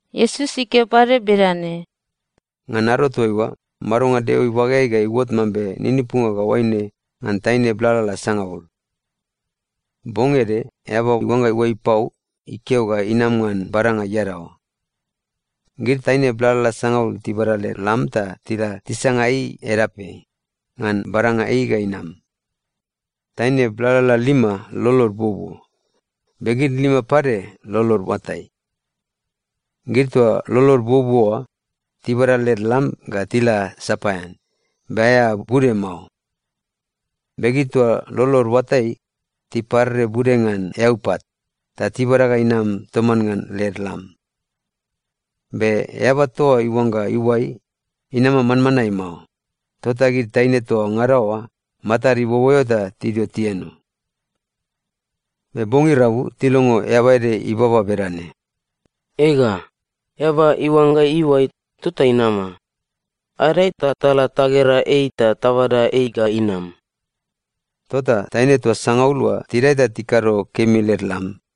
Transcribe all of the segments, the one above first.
Iesus ikeo pade bedane, “Ngan ado toaiua, madonga Deo ibageai ga iuot mambe ninipunga ga oaine ngan taine blalala sangaul. Bong ede eaba iuangga iuai pau ikeo ga inama ngan badanga iadaoa. Gid taine blalala sangaul tibada led lam ta tila tisanga ei edapeai, ngan badanga ei ga inam. Taine blalala lima lolod buobuo, be gid lima pade lolod iuatai. Gid toa lolod buobuo oa, tibada led lam ga tila sapaean, be aea bude mao. Be gid toa lolod iuatai, tiparere bude ngan eaupat, ta tibada ga inam toman ngan led lam. Be eaba toa iuangga iuai, inama manmanae mao, tota gid taine toa ngada oa matad iboboeo ta tidio tieno. “Be bong irabu tilongo eaba ede ibaba bedane, ‘Ega, eaba iuangga iuai tota inama! Adae ta tala tagera ei ta tabada ei ga inam.’ “Tota taine toa sangaul oa tidae ta tikado kemi led lam.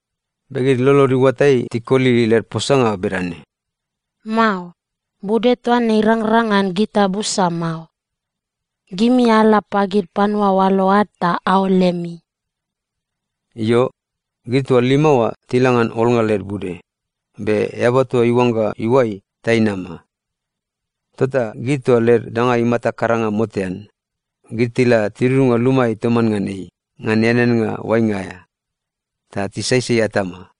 “Be gid lolod iuatai tikoli led posanga bedane, ‘Mao. Bude toa ne irangrang ngan gita busa mao. Gimi ala pagid panua oalo ad ta aol lemi.’ “Io, gid toa lima oa tila ngan olnga led bude, be eaba toa iuangga iuai, ta inama. Tota gid toa led danga imata karanga motean, gid tila tidudunga lumaeai toman ngan ei ngan eaneannga oainga aea. Ta tisaisai atama.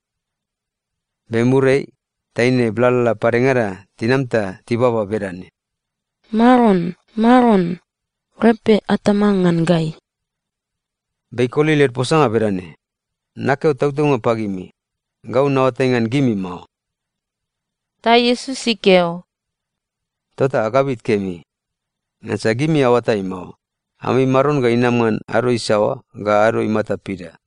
“Be muriai, taine blalala padengada tinam ta tibaba bedane, ‘Maron, maron, repe atama ngan gai.’ “Be ikoli led posanga bedane, ‘Nakeo tautaunga pagimi, gau naoatai ngan gimi mao.’” Ta Iesus ikeo, “Tota agabit kemi. Ngansa gimi aoatai mao, ami Maron ga inama ngan ado isaoa ga ado imata pida.”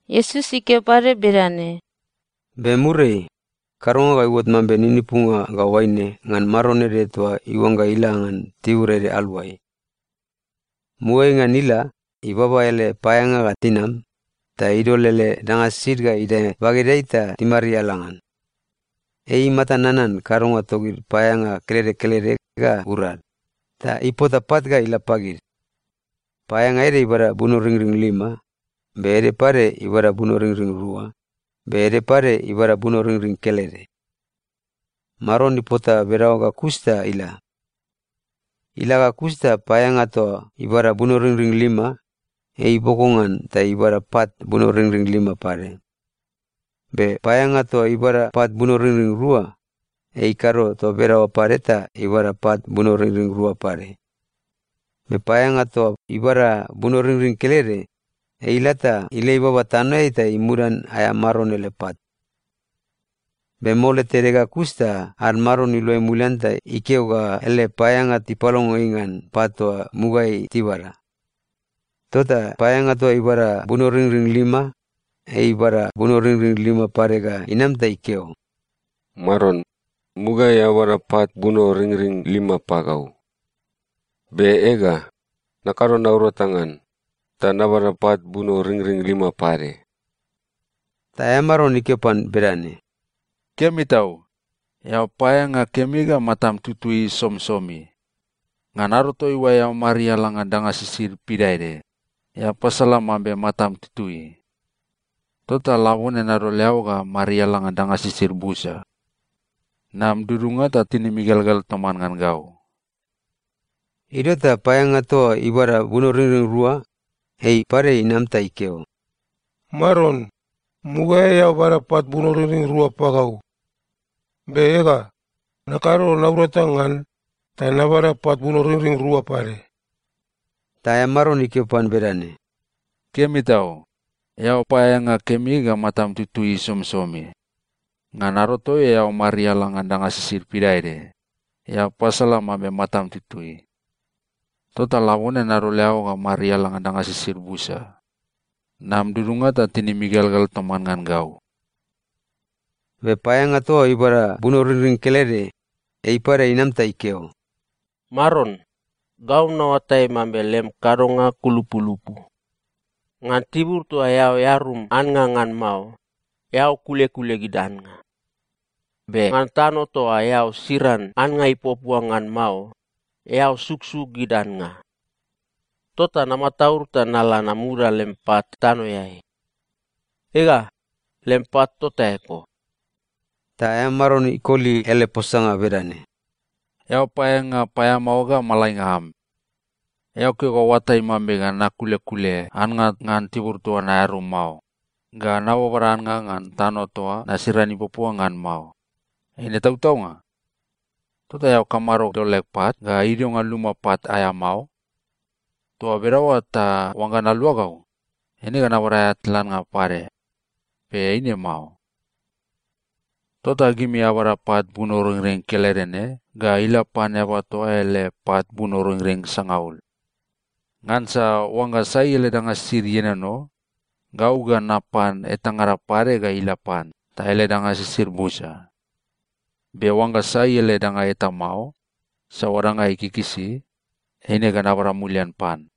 Iesus ikeo pade bedane, “Be muriai, kadonga ga iuot mambe ninipunga ga oaine ngan maron ede toa iuangga ila ngan tibur ede aluai. Mugaeai ngan ila, ibaba ele paeaeanga ga tinam, ta idol ele danga sisid ga idae bagedeai ta timariala ngan. Ei imata nanan kadonga togid paeaeanga kelede kelede ga urad, ta ipota pat ga ila pagid. Paeaeanga ede ibada bunoringring lima, be ede pade ibada bunoringring rua, be ede pade ibada bunoringring kelede. Maron ipota bedaoa ga kus ta ila. Ila ga kus ta paeaeanga toa ibada bunoringring lima, ei iboko ngan ta ibada pat bunoringring lima pade. Be paeaeanga toa ibada pat bunoringring rua, ei ikado toa bedaoa pade ta ibada pat bunoringring rua pade. Be paeaeanga toa ibada bunoringring kelede, ei ila ta ilei baba tanoeai ta imudan aea maron ele pat. “Be mole tede ga kus ta ad maron iluai mulian ta ikeo ga ele paeaeanga tipalongo ei ngan pat toa mugaeai tibada. Tota paeaeanga toa ibada bunoringring lima, ei ibada bunoringring lima pade ga inam ta ikeo, ‘Maron, mugaeai eao bada pat bunoringring lima pagau. Be ega, nakado naurata ngan, ta nabada pat bunoringring lima pade.’ “Ta aea maron ikeo pan bedane, ‘Kemi tau! Eao paeaeanga kemi ga matam tutui somisomi. Ngan ado toaiua eao mariala ngan danga sisid pidaede, eao pasolan mambe matam tutui. Tota labone nadol eao ta mariala ngan danga sisid busa. Nam dudunga ta tinim igelgel toman ngan gau.’ “Idio ta paeaeanga toa ibada bunoringring rua, ei pade inam ta ikeo, ‘Maron, mugaeai eao bada pat bunoringring rua pagau. Be ega, nakado naurata ngan, ta nabada pat bunoringring rua pade.’ “Ta aea maron ikeo pan bedane, ‘Kemi tau! Eao paeaeanga kemi ga matam tutui somisomi. Ngan ado toaiua eao mariala ngan danga sisid pidaede, eao pasolan mambe matam tutui. Tota labone nadol eao ta mariala ngan danga sisid busa. Nam dudunga ta tinim igelgel toman ngan gau.’ “Be paeaeanga toa ibada bunoringring kelede, ei pade inam ta ikeo, ‘Maron, gau naoatai mambe lem kadonga kulupulupu. Ngan tibur toa eao earum annga ngan mao, eao kulekule gid annga. Be ngan tano toa eao siran annga ipuapua ngan mao, eao suksuk gid annga. Tota namataud ta nala namudan lem pat tanoeai. Ega, lem pat tota eko.’ “Ta aea maron ikoli ele posanga bedane, ‘Eao paeaeanga paeamao ga malainga am! Eao keo ga oatai mambe nakulekule annga ngan tibur toa naearum mao, ga nababada annga ngan tano toa nasiran ipuapua ngan mao. Eine tautaunga? Tota eao kamado dol leg pat ga idio ngan luma pat aea mao? Toa bedaoa ta oangga naluagau, eine ga nabada aea tlannga pade, be eine mao.’ “‘Tota gimi abada pat bunoringring kelede ne ga ila pan eaba toa ele pat bunoringring sangaul. Ngansa oangga sai ele danga sisid ienono, gau ga napan etangada pade ga ila pan ta ele danga sisid busa. Be oangga sai ele danga eta mao, saoa danga ei ikikisi, eine ga nabada mulian pan.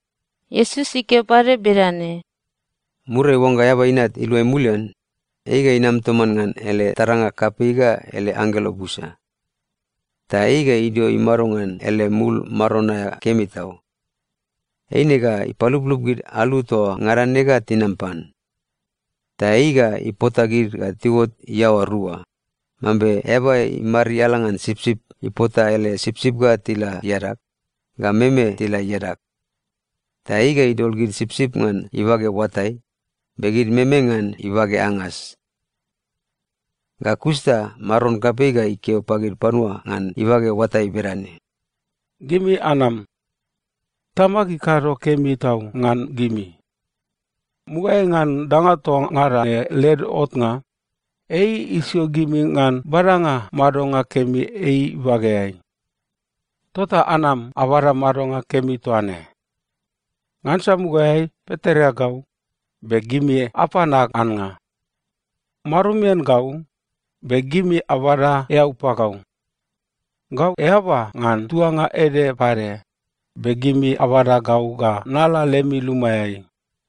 Iesus ikeo pade bedane, “Muriai oangga Eaba Inat iluai mulian, ei ga inam toman ngan ele taranga kapei ga ele anggelo busa. Ta ei ga idio imado ngan ele mul Maron aea kemi tau. Eine ga ipaluplup gid alu toa ngada ne ga tinam pan. Ta ei ga ipota gid ga tiuot iaoa rua, mambe eaba imariala ngan sipsip ipota ele sipsip ga tila iadag, ga meme tila iadag. Ta ei ga idol gid sipsip ngan ibage oatai, be gid meme ngan ibage angas. “Ga kus ta Maron kapei ga ikeo pagid panua ngan ibage oatai bedane, ‘Gimi anam. Tamag ikado kemi tau ngan gimi! Mugaeai ngan danga toa ngada ne led otnga, ei isio gimi ngan badanga madonga kemi ei ibageai. Tota anam abada madonga kemi toa ne! Ngansa mugaeai pitoreagau, be gimi apan ag annga. Marumian gau, be gimi abada eau pagau. Gau eaba ngan tuanga ede pade, be gimi abada gau ga nala lemi lumaeai.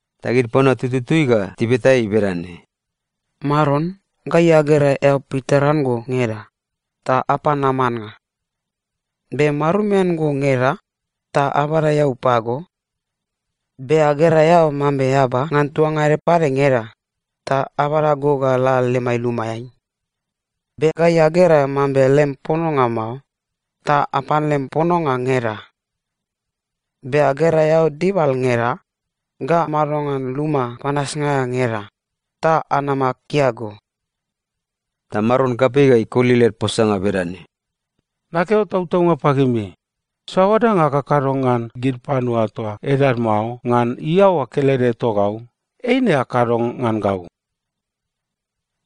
“Ta gid panua tututui ga tibeta ei bedane, ‘Maron, gai agera eao pitoreago ngeda, ta apan am annga? Be marumian go ngeda, ta abada eau pago? Be agera eao mambe eaba ngan tuanga ede pade ngeda, ta abada go ga la lemai lumaeai? Be gai agera mambe lem pononga mao, ta apan lem pononga ngeda? Be agera eao dibal ngeda, ga mado ngan luma panasnga aea ngeda, ta anama akia go?’ “Ta Maron kapei ga ikoli led posanga bedane, ‘Nakeo tautaunga pagimi, saoa danga akakado ngan gid panua toa edad mao ngan iaoa kelede togau, eine akado ngan gau.’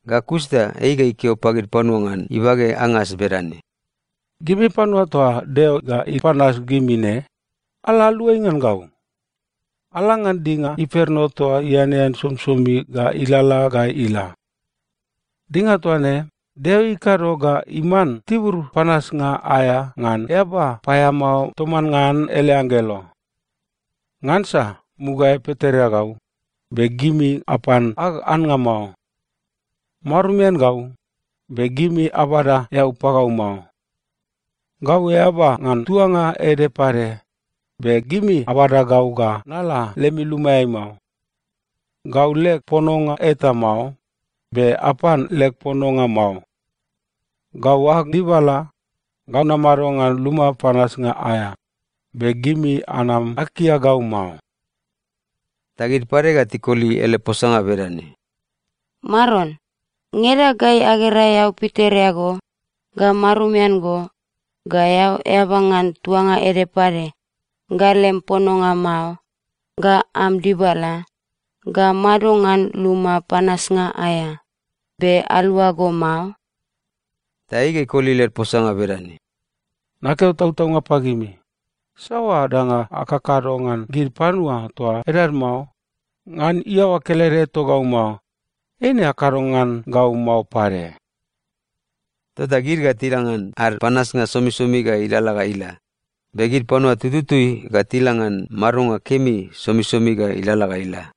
“Ga kus ta ei ga ikeo pagid panua ngan ibage angas bedane, ‘Gimi panua toa Deo ga ipanas gimi ne, ala aluai ngan gau! Ala ngan dinga imperno toa ianean somisomi ga ilalala ga ila. Dinga toa ne, Deo ikado ga iman tibur panasnga aea ngan eaba paeamao toman ngan ele anggelo. Ngansa mugaeai pitoreagau, be gimi apan ag annga mao. Marumian gau, be gimi abada eau pagau mao. Gau eaba ngan tuanga ede pade, be gimi abada gau ga nala lemi lumaeai mao. Gau leg pononga eta mao, be apan leg pononga mao. Gau ag dibala, ga namado ngan luma panasnga aea, be gimi anam akia gau mao.’ “Ta gid pade ga tikoli ele posanga bedane, ‘Maron, ngeda gai agera eao pitoreago, ga marumian go, ga eao eaba ngan tuanga ede pade, ga lem pononga mao, ga am dibala, ga mado ngan luma panasnga aea, be alua go mao?’ “Ta ei ga ikoli led posanga bedane, ‘Nakeo tautaunga pagimi, saoa danga akakado ngan gid panua toa edad mao ngan iaoa kelede togau mao, eina akado ngan gau mao pade.’ “Tota gid ga tila ngan ad panasnga somisomi ga ilalala ga ila. Be gid panua tututui ga tila ngan madonga kemi somisomi ga ilalala ga ila.”